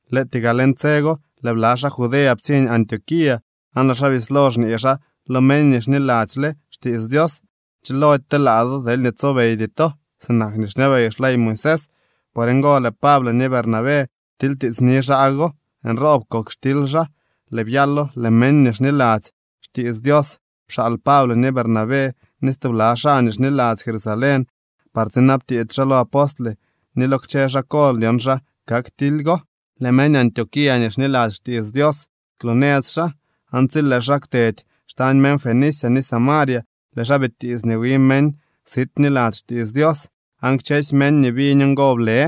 Lëëtyee gaa leñ tse go, lëë bla xaa Judea ptsiñ Antioquía, aan lëë xaa bislo xñee xaa lo meñ nii xniladzyle xtiits Dios: Chilody telaa do deelñee tsobeydy to sinak nii xñabey xley Moisés. Por ngo lëë Pable ni Bernabé ptilytiitsni xaa go. Nroob kok xtily xaa, lëë byalo lëë meñ nii xniladzy xtiits Dios pxaal Pable ni Bernabé ni stubla xaa nii xniladzy Jerusalén par tsinabtiits xaa lo apostle ni lo kchë xaa kol dyon xa kak tily go. Lëë meñ Antioquía nii xniladzy xtiits Dios kwloonëz xaa, aan tsi lëë xaa kwtedy xtañ meñ Fenicia ni Samaria, lëë xaa bitiits nii wi meñ sit bniladzy xtiits Dios. Aan kchësy meñ nii biñ ngo ble.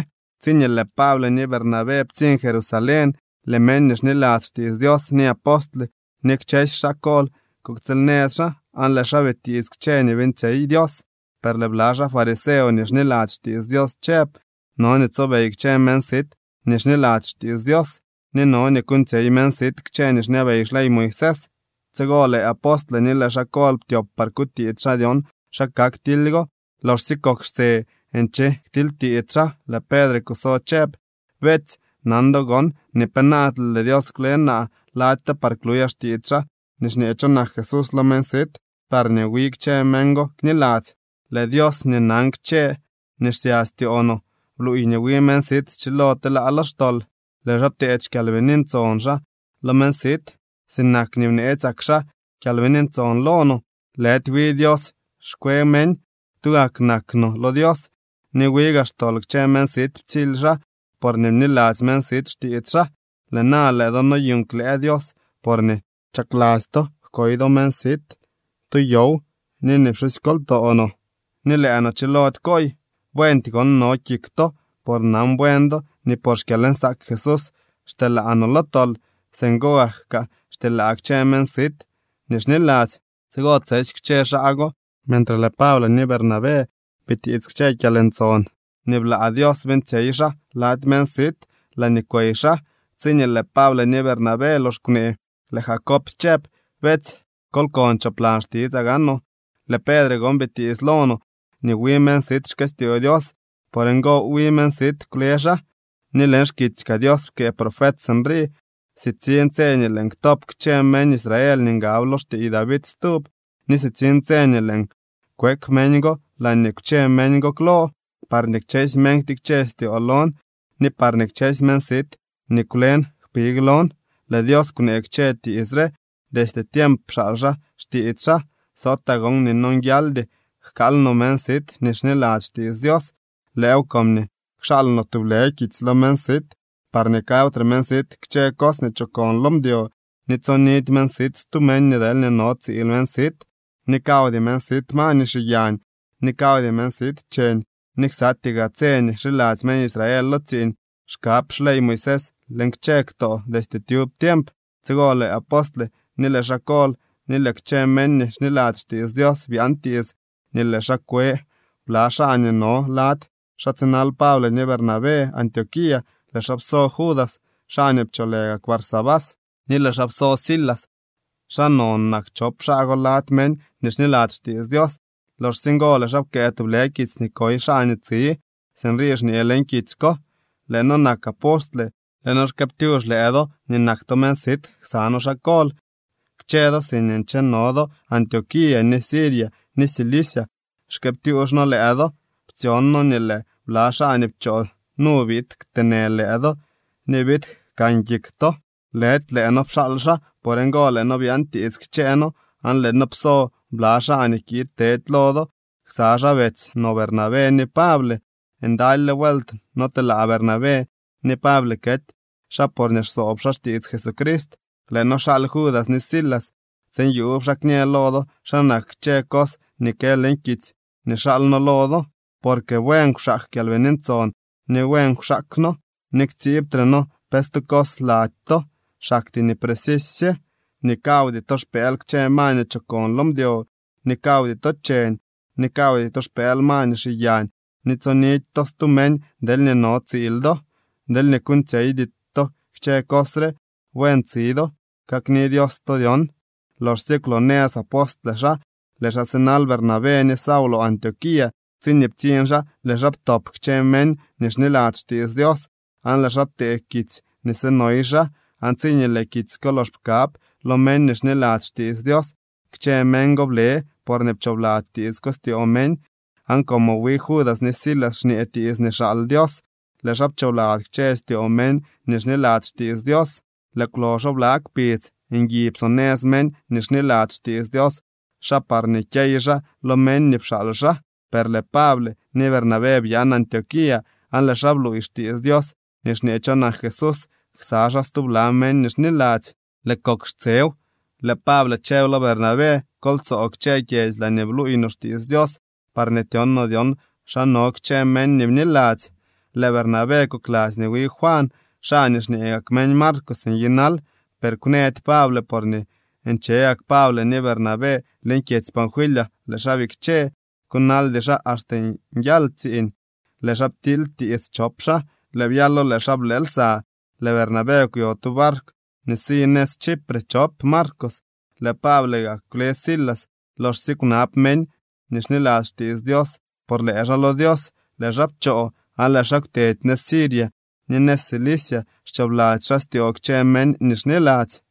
Tsiñee lëë Pable ni Bernabé ptsiñ Jerusalén, lëë meñ nii xniladzy xtiits Dios, ni apostle, ni kchësy xaa kol kuktsiil nëz xaa, aan lëë xaa bitiits kchë nii beeñtsyey Dios. Per lëë bla xaa fariseo nii xniladzy xtiits Dios chëb: —No nii tsobey kchë meñ sit nii xniladzy xtiits Dios, ni no nii kuuñtsyey meñ sit kchë nii xñabey xley Moisés. Tsigo lëë apostle ni lëë xaa kol ptyop par kutiits xaa dyon xa kak tily go. Loxsye kok xtse nche ktilytiits xaa, lëë Pedre kuso chëb: —Beetsy, nan do gon nii penaadle lëë Dios kwle naa lady to par kluyaa xtiits xaa nii xñee cho nak Jesús lo meñ sit parñee wi kchë meñ go kniladzy. Lëë Dios nii nan kchë nii xsya styoo no, bluuy nii wi meñ sit schilo telaa lo xtol. Lëë xaa pteedy xKyalbini Ntson xaa lo meñ sit sinak nii bneetsyak xaa Kyalbini Ntson lo no. Lëdy wi Dios xkwe meñ. Tugak nak no lo Dios, ni wi gaa xtol kchë meñ sit ptsily xaa porñee bniladzy meñ sit xtiits xaa. Lëë na, lëë do noyuuñ klëë Dios, porñee chakladzy to jkoy do meñ sit tu yow ni nii pxusykoltoo no ni lëë no chilody kooy. Buendy gon no kik to, por nan buen do nii por xkyalnsaak Jesús xtyelaa no lo tol. Singo gak kaa xtyelaa kchë meñ sit nii xniladzy. Tsigo tsesy kwche xaa go, mentre lëë Pable ni Bernabé bitiits kchë kyalntson nii blaa Dios beeñtsyey xaa lady meñ sit laañee kwey xaa. Tsiñee lëë Pable ni Bernabé lox kwnee, lëë Jacob chëb: —Beetsy, kol kon choplan xtitsaa gaanoo. Lëë Pedre gon bitiits lo no nii wi meñ sit xkëstyoo Dios. Por ngo, wi meñ sit kwle xaa. Ni leñ xkitsy kaa Dios pkëë profet sinrii: Sitsiñ tse nii lëën ktop kchë meñ Israel nii ngab lo xtiiy David stub, ni sitsiñ tse nii lëën kwek meñ go laañee kwche meñ go klo, parñee kchësy meñ ktikche styoo lon, ni parñee kchësy meñ sit nii kwlen kpig lon. Lëë Dios kwnee kchë tiits re, destye tiemp pxaal xaa xtiits xaa. ’Sootaa gon nii nonguialdy jkaal no meñ sit nii xniladzy xtiits Dios. Lëëw comñee kxaal no tublë kitsy lo meñ sit parñee kawtre meñ sit kchë cos nii chokon lo mdyo, ni tsonidy meñ sit stu meñ deel no tsiil meñ sit, ni kawdy meñ sit ma nii xiyañ, ni kawdy meñ sit cheñ. Ni ksatyee gaa tse nii xiladzy meñ Israel lo tsiiñ xkab xley Moisés leñ kchë ktoo destye tyub tiemp. Tsigo lëë apostle, ni lëë xaa kol ni lëë kchë meñ nii xniladzy xtiits Dios byaan tiits nii lëë xaa kwe bla xaa nii no lady xaa tsinal Pable ni Bernabé Antioquía. Lëë xaa pso Judas, xaa nii pcholë gak Barsabás, ni lëë xaa pso Silas. Xaa non nak chop xaa go lady meñ nii xniladzy xtiits Dios. Loxsye ngo lëë xaa pkëë tublë kitsy nii koy xaa nii tsi. Sinrii xñee leñ kitsy ko: “Lëë noo nak apostle. Lëë noo xkëëptyux lëë do nii nak to meñ sit ksa noo xaa kol. Kchë do siñee ncheno do Antioquía, ni Siria ni Cilicia xkëëptyuux noo lëë do. Ptsyon noo nii lëë bla xaa nii pchoo nu biid kteenë lëë do ni biid jkan kik to. Lëdy lëë noo pxaal xaa. Por ngo lëë noo byaantiits kchëë noo, aan lëë noo pso bla xaa nii kiid tedy lo do ksa xaa betsy no Bernabé ni Pable. Ndalyle vuelt notelaa Bernabé ni Pable kety xaa porñee xsoob xaa xtiits Jesucrist. Lëë noo xaal Judas ni Silas tsiin yuub xaa kñë lo do xa nak kchë cos nii kë leñ kitsy nii xaal noo lo do. Porque buen kwxaak Kyalbini Ntson ni buen kwxaak noo, nii ktsiibtre noo pe stu cos lady to, xaktyee nii precisy sye nii kawdy to xpëël kchë ma nii chokon lo mdyo, ni kawdy to cheñ, ni kawdy to xpëël ma nii xiyañ, ni tsonidy to stu meñ deelñee no tsiil do. Deelñee kuuñtsyeydy to kchë cos re, buen tsi do. Kakni Dios to dyon.” Loxsye kwloonëz apostle xaa, lëë xaa sinal Bernabé ni Saulo Antioquía. Tsiñee ptsiñ xaa, lëë xaa ptop kchë meñ nii xniladzy xtiits Dios aan lëë xaa ptee kitsy nii sinoy xaa. Aan tsiñee lëë kitsy ko lox pkab lo meñ nii xniladzy xtiits Dios, kchë meñ go ble porñee pchoobladzy tiits ko styoo meñ. Aan como wi Judas ni Silas xñee tiits nii xaal Dios, lëë xaa pchoobladzy kchë styoo meñ nii xniladzy xtiits Dios. Lëë kwloxo bla kpidz ngui psonëz meñ nii xniladzy xtiits Dios xaa parñee kyey xaa lo meñ nii pxaal xaa. Per lëë Pable ni Bernabé byaan Antioquía aan lëë xaa bluuy xtiits Dios nii xñee cho nak Jesús ksa xaa stubla meñ nii xniladzy. Lëë kok xtsew, lëë Pable chëb lo Bernabé: —Kol tsoo kchë kyedzy laañee bluuy no xtiits Dios parñee tyon no dyon xa no kchë meñ nii bniladzy. Lëë Bernabé kokladzy nii wi Juan, xaa nii xñee gak meñ Marcos nyinal. Per kwnëdy Pable porñee nche gak Pable ni Bernabé leñ kyedzy Panfilia, lëë xaa bikche, kunaldy xaa axte nyal tsiiñ. Lëë xaa ptilytiits chop xaa, lëë byalo lëë xaa blë lsa. Lëë Bernabé kwyo tu barkw nii si nëz Chipre chop Marcos. Lëë Pable gaa kwle Silas. Loxsye kwnab meñ nii xniladzy xtiits Dios por lëë xaa lo Dios, lëë xaa pchoo, aan lëë xaa kwtedy nëz Siria ni nëz Cilicia xchoobladzy xaa styoo kchë meñ nii xniladzy.